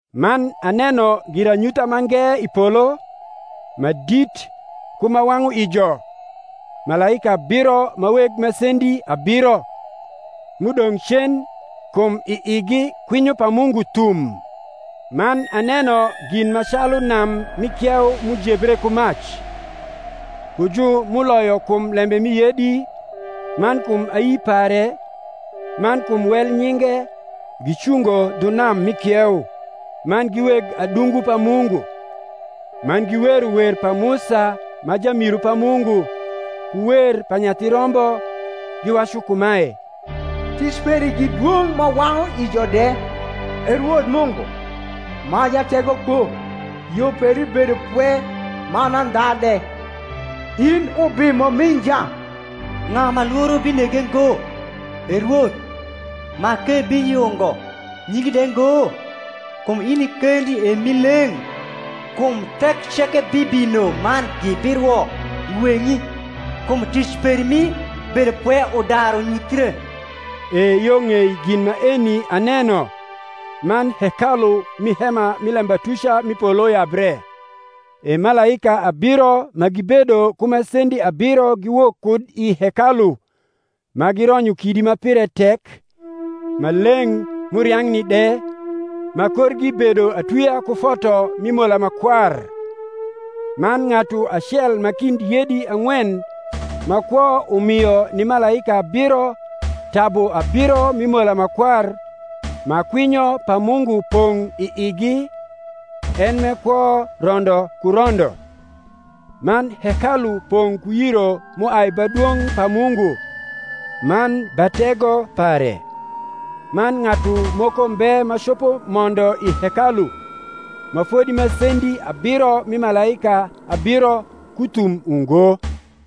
Man aneno giranyutha mange i polo, ma dit ku ma wang’u ijo, malaika abiro ma weg masendi abiro, m’udong’ cen, kum i igi kwinyo pa Mungu thum. Man aneno gin ma calu nam mi kieu m’ujebre ku mac: ku ju m’uloyo kum lembe mi yedi, man kum ayi pare, man kum wel nyinge, gicungo dhu nam mi kieu, man gi weg adungu pa Mungu. Man giwero wer pa Musa ma jamiru pa Mungu, ku wer pa Nyathi Rombo, giwacu kumae, Tic peri gi dwong’ ma wang’u ijo de, E Rwoth Mungu, ma Jategokpo; yo peri bedo pwe man audha de, in Ubimo mi nja. Ng’a ma lworo binege ngo, E Rwoth, ma k’ebiyungo nyingi de ngo? kum in i kendi e m’i leng’; kum thek ceke bibino man gibirwo i weng’i; kum tic peri mi bedopwe udaru nyuthre. E yo ng’ei gin maeni aneno, man hekalu mi hema mi lebatuca mi polo yabre: e malaika abiro ma gibedo ku masendi abiro giwok kud i hekalu, ma gironyo kidi ma pire tek, ma leng’ m’uriang’ni de, ma korgi bedo atwia ku foto mi mola ma kwar. Man ng’atu acel ma kind yedi ang’wen ma kwo umio ni malaika abiro tabu abiro mi mola ma kwar ma kwinyo pa Mungu pong’ i igi, en m’e kwo rondo ku rondo. Man hekalu pong’ ku yiro m’uai ba dwong’ pa Mungu, man ba tego pare; man ng’atu moko mbe ma copo mondo i hekalu, ma fodi masendi abiro mi malaika abiro ku thum ungo.